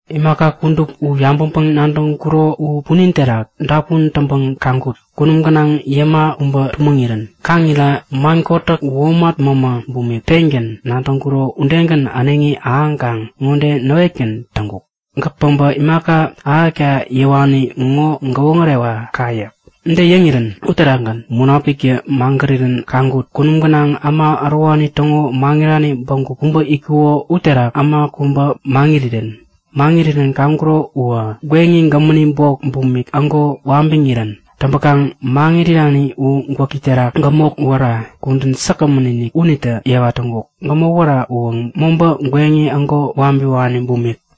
Imaka kudup u yabäŋpäŋ-nadäŋkuro u punin terak dapun täŋpäŋ kaŋkut; Kunum gänaŋ yäma kubä tumäŋirän. Kaŋ irira man kotäk, womat mämä bumik pengän nadäŋkuro unitägän äneŋi ahäŋkaŋ ŋode näwetgän täŋkuk; Gäk päbä imaka ahäkta yäwani ŋo gäwoŋärewa ka yäk. Ude yäŋirän uterakgän Munapiktä magärirän kaŋkut; Kunum gänaŋ äma ärowani täŋo mäŋirani bägup kubä itkuko uterak äma kubä maŋirirän. Maŋirirän kaŋkuro uwä gweŋi gämäni bok bumik ägo wabiŋ irirän. Täŋpäkaŋ maŋit irani u gwäki terakä gämok wära kudän säkgämän-inik unitä yewa täŋkuk. Gämok wära uwä mobä gweŋi ägo wabiwani bumik.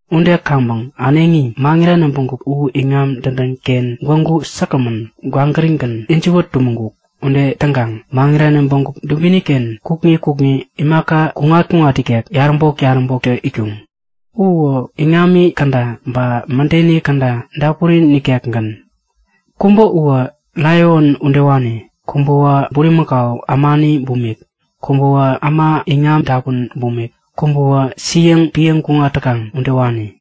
Ude kaŋpäŋ äneŋi, maŋirani bägup u iŋam dädän-ken gwägu säkgämän, kwawanigän, ijiwä tumäŋ-kuk. Ude täŋkaŋ maŋirani bägup dubini-ken kukŋi kukŋi imaka kuŋat-kuŋat ikek yaräbok-yaräboktä itkuŋ. U uwä iŋami käda ba mädeni käda dapuri nikekgän. Kubä uwä laion udewani. Kubäwä bulimakau ämani bumik. Kubäwä äma iŋam dapun bumik. Kubäwä siäŋ piäŋ kuŋat täkaŋ udewani.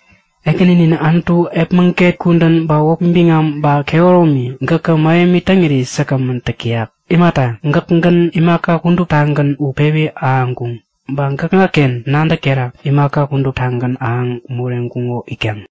Ekäninin Anutu epmäget kudän ba wäpi biŋam ba kehäromi, gäkä mähemi täŋiri säkgämän täk täyak. Imata, gäkägän imaka kuduptagän u pewi ahäŋkuŋ. Ba gäkŋaken nadäk terak imaka kuduptagän ahäŋ moreŋkuŋo itkaŋ.